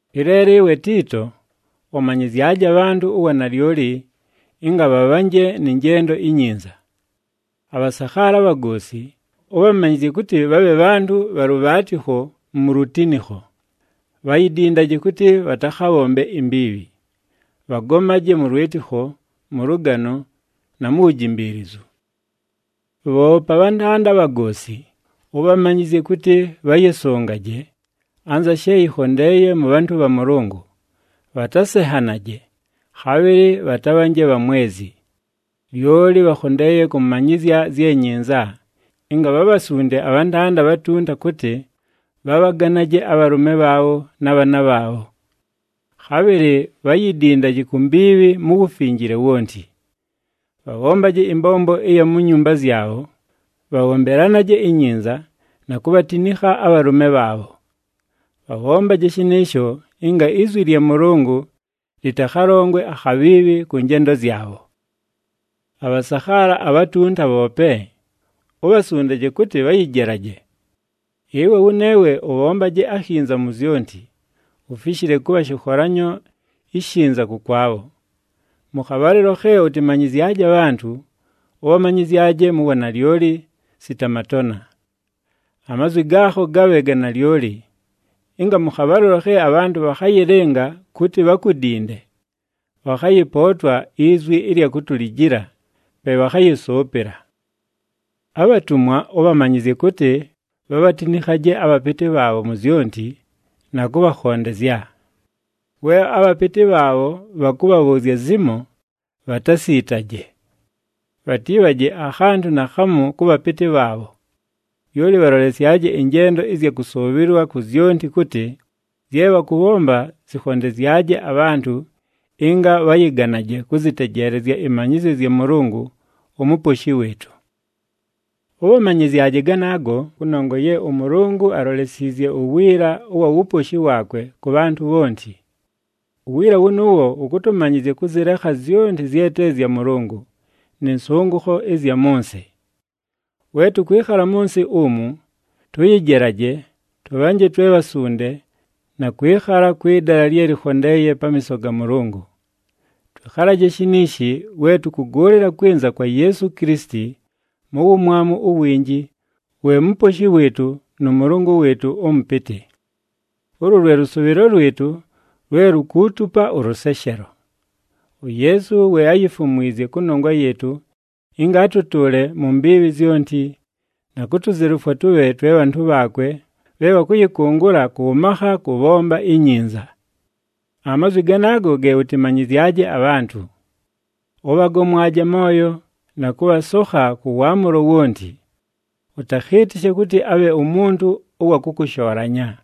Ɨleelo ɨwe Tiito, ʉmanyɨzyaje abhantʉ uwanalyoli ɨnga bhabhanje nɨ njendo inyinza. Abhasakhaala abhagoosi, ʉbhamanyɨzye kʉtɨ bhabhe bhantʉ bha lʉbhaatɨkho mu lutinikho. Bhayidindaje kʉtɨ bhatakhabhombe imbiibhi. Bhagomaje mʉ lwɨtɨkho, mʉ lʉgano, na mu wujimbiilizu. Bhoope abhantanda abhagoosi, ʉbhamanyɨzye kʉtɨ bhayɨsʉngaje, anza she yɨkhondeeye mʉ bhantʉ bha Mʉlʉngʉ, bhatasenhanaje, khabhɨlɨ bhatabhanje bhamwezi. Lyoli bhakhondeeye kʉmanyɨzya zye nyinza, ɨnga bhabhasunde abhantanda abhatunta kʉtɨ, bhabhaganaje abhalʉme bhaabho na bhaana bhaabho. Khabhɨlɨ bhayidindaje ku mbiibhi mu wufinjile wonti. Bhabhombaje ɨmbombo ɨya mu nyumba zyabho, bhabhombelanaje inyinza, na kubhatinikha abhalʉme bhaabho. Bhabhombaje shɨnɨɨsho ɨnga izwi lya Mʉlʉngʉ lɨtakhalongwe akhabhiibhi kʉ njendo zyabho. Abhasakhaala abhatunta bhoope, ubhasundaje kʉtɨ bhayɨjelaje. Ɨwe wʉneewe ʉbhombaje akhinza mu zyonti, ufishile kʉbha shɨkholanyo ishinza kʉkwabho. Mʉ khabhalɨlo khe ʉtɨmanyɨzyaje abhantʉ, ʉbhamanyɨzyaje mu wanalyoli, sita matona. Amazwi gaakho gabhe ga nalyoli, ɨnga mʉ khabhalɨlo khe abhantʉ bhakhayɨlɨnga kʉtɨ bhakudinde, bhakhayɨpootwa izwi ɨlya kutulijila, pe bhakhayɨsʉʉpɨla. Abhatumwa, ʉbhamanyɨzye kʉtɨ bhabhatinikhaje abhapɨtɨ bhaabho mu zyonti, na kʉbhakhondezya. We abhapɨtɨ bhaabho bhakʉbhabhʉʉzya zimo, bhatasiitaje. Bhatiibhaje akhantʉ naakhamu kʉ bhapɨtɨ bhaabho. Lyoli bhalolesyaje ɨnjendo ɨzya kʉsʉʉbhɨlwa ku zyonti kʉtɨ, zye bhakʉbhomba zɨkhondezyaje abhantʉ ɨnga bhayɨganaje kʉzɨtejeelezya ɨmanyɨzyo zya Mʉlʉngʉ uMuposhi wɨɨtʉ. Ʉbhamanyɨzyaje ganaago kʉnongwa ye ʉMʉlʉngʉ alolesiizye uwiila ʉwa wuposhi waakwe kʉ bhantʉ bhonti. Uwiila wʉnʉʉwo wʉkʉtʉmanyɨzya kʉzɨlekha zyonti zye te zya Mʉlʉngʉ, nɨ nsʉngʉkho ɨzya mʉ nsɨ. We tʉkwɨkhala mʉ nsɨ umu, tʉyɨjelaje, tʉbhanje twe bhasunde, na kwɨkhala kwɨ dala lye lɨkhondeeye pamiiso ga Mʉlʉngʉ. Twɨkhalaje shiniishi we tʉkʉgʉʉlɨla kwɨnza kwa Yeesu Kilisiti mu wumwamu uwinji, we Muposhi wɨɨtʉ nʉ Mʉlʉngʉ wɨɨtʉ ʉMʉpɨtɨ. Ulu lwe lʉsʉʉbhɨlo lwɨtʉ lwe lukuutupa ʉlʉseshelo. UYeesu we áyifumwizye kʉnongwa yɨɨtʉ ɨnga atʉtʉʉle mu mbiibhi zyonti, na kutuzelufwa tʉbhe twe bhantʉ bhaakwe bhe bhakʉyɨkʉngʉla kʉ makha kʉbhomba inyinza. Amazwi ganaago ge ʉtɨmanyɨzyaje abhantʉ. Ʉbhagomwaje amooyo, na kʉbhasokha kʉ waamʉlo wonti. Ʉtakhɨɨtɨshe kʉtɨ abhe umuntu ʉwa kʉkʉshoolanya.